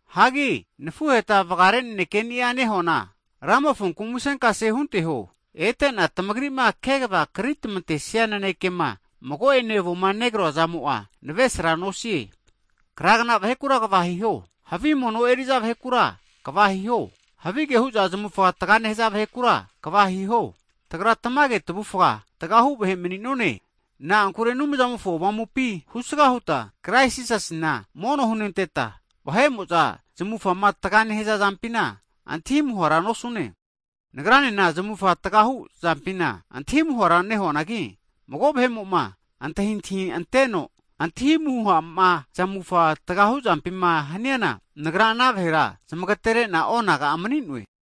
Hagi nafuheta vagare naneke'ni'a nehuana, Ramofonku musenkase hunteho. Ete'na tamagri'ma kegava kritmantesia nanekema mago'ene avoma negroa zamo'a navesra nosie. Kragna vahekura kva hiho, havi mono eri'za vahekura kva hiho, havige hu'za zamufa taga nehaza vahe'kura kva hiho, Tagra tamage tavufa tgahu vahe mani'none. Na'ankure Anumzamofo Avamupi husga huta Krais Jisasina mono hunenteta, vahe'mo'za zamufama taga nehaza zampina antahi muhara nosune. Nagranena zamufa tgahu zampina antahi muhara nehuanagi, mago vahe'mo'ma antahintahi anteno antahi muha'ma zamufa tgahu zampima haniana, nagra ana vahera zamagatere'na onaga'a mani'noe.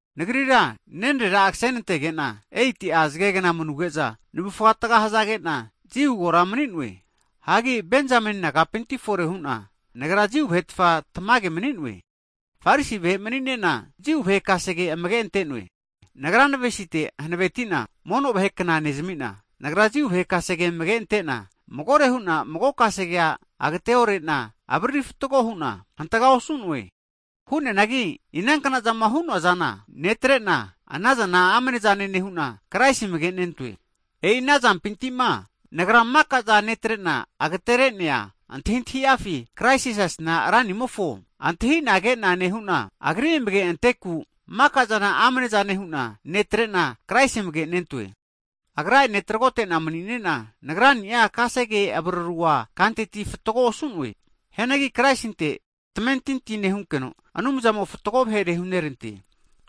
Nagrira nenarera'a kasenantege'na 8'a zagegna manuge'za, navufa taga hazage'na, Jiu kora mani'noe. Hagi Benjameni nagapinti fore hu'na, nagra Jiu vahetfa tamage mani'noe. Farisi vahe mani'nena Jiu vahe kasege amage ante'noe. Nagra navesite hanaveti'na mono vahera kna nezamina, nagra Jiu vahe kasege amage ante'na magore huna mago kasegea agateore'na, avariri fatgo huna hantaga osu'noe. Hu'neanagi inankna'zama hu'noazana netre'na, anazana amnezane nehu'na, Kraisi amage'nentoe. E'i ana zantamimpina, nagra maka'za netre'na agtere'nea antahintahi'afi Krais Jisasina Ranimofo antahinagena nehu'na, Agri amage anteku maka'zana amnezane hu'na netre'na, Kraisi amage' nentoe. Agra'ene tragote'na mani'ne'na, nagra'ni'a kasege avarurua kanteti fatgoa osu'noe. Hianagi Kraisinte tamentinti nehunkeno, Anumzamo fatgo vahere hunerante.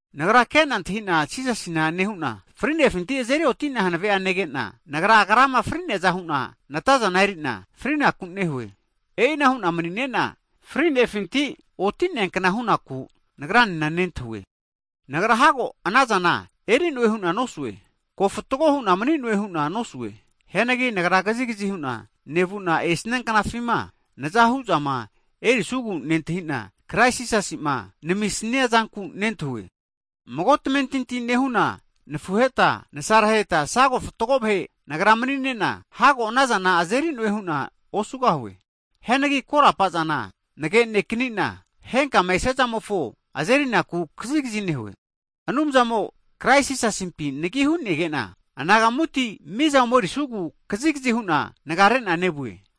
Nagra ke'na antahi'na Jisasina nehu'na, fri'nefinti azeri oti'nea hanave'a nege'na, nagra Agrama fri'neaza hu'na nataza eri'na frinaku nehue. E'ina hu'na mani'ne'na, fri'nefinti oti'neankna hunaku nagranena nentahue. Hagi nagra hago anazana eri'noe hu'na nosue, ko fatgo hu'na mani'noe hu'na nosue. Hianagi nagra kazigazi hu'na nevu'na esnia knafima naza hu'zama erisugu nentahi'na, Krais Jisasi'ma namisnia zanku nentahue. Mago tamentinti nehuna nafuhetane, nsareheta sago fatgo vahe nagra mani'ne'na hago anazana azeri'noe hu'na osugahue. Hianagi korapa'zana nage'nekni'na, henkama esiazamofo azerinaku kazigazi nehue. Anumzamo'a Krais Jisasimpi nagi hu'nege'na anagamuti miza omerisugu kazigazi hu'na nagare'na nevue.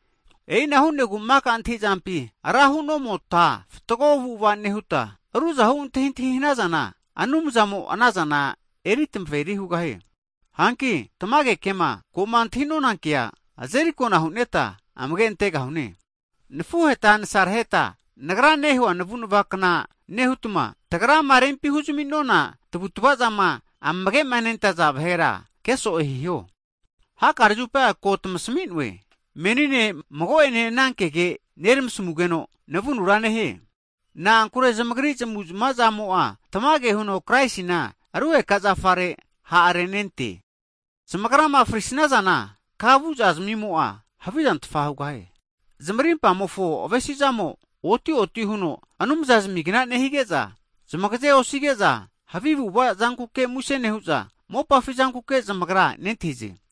E'ina hu'negu maka antahi'zampi ra hu'nomota, fatgo avu'ava nehuta, ruzahu antahintahi hanazana Anumzamo'a anazana eri tamaveri hugahie. Hanki tamage kema, ko'ma antahi'nona kea azerikona hu'neta amage'antegahune. Nafuheta nasareheta nagra nehua navunavakna nehutma, tagrama rempi huzaminona tavutavazama amagema nentaza vahera ke'so'e hiho. Hakare'a zupa ko tamasmi'noe, menine mago'ene anankege neramasmugeno navunura nehie. Na'ankure zamagri zamu'zmazamo'a tamage huno Kraisina rugeka zafa'a ha'arenente. Zamagrama fri'snazana, kama vu'zazmimo'a havizantfa hugahie. Zamarimpamofo avesi'zamo oti oti huno anumza zamigna nehige'za, zamagaze osige'za, havi avu'ava zanku muse nehu'za, mopafi zankuke zamagra nentahize.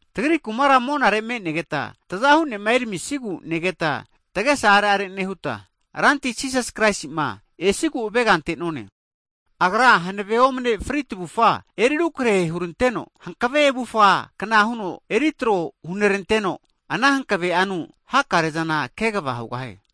Tagri kumara monare me'negeta, Tazahu ne'ma eramisigu negeta tagesa are'are nehuta, Ranti Jisas Kraisi'ma esigu avega ante'none. Agra hanave omne fri tavufa eri rukrahe huranteno, hankave avufa kna huno eri tro huneranteno, ana hankave'anu hakare zana kegava hugahie.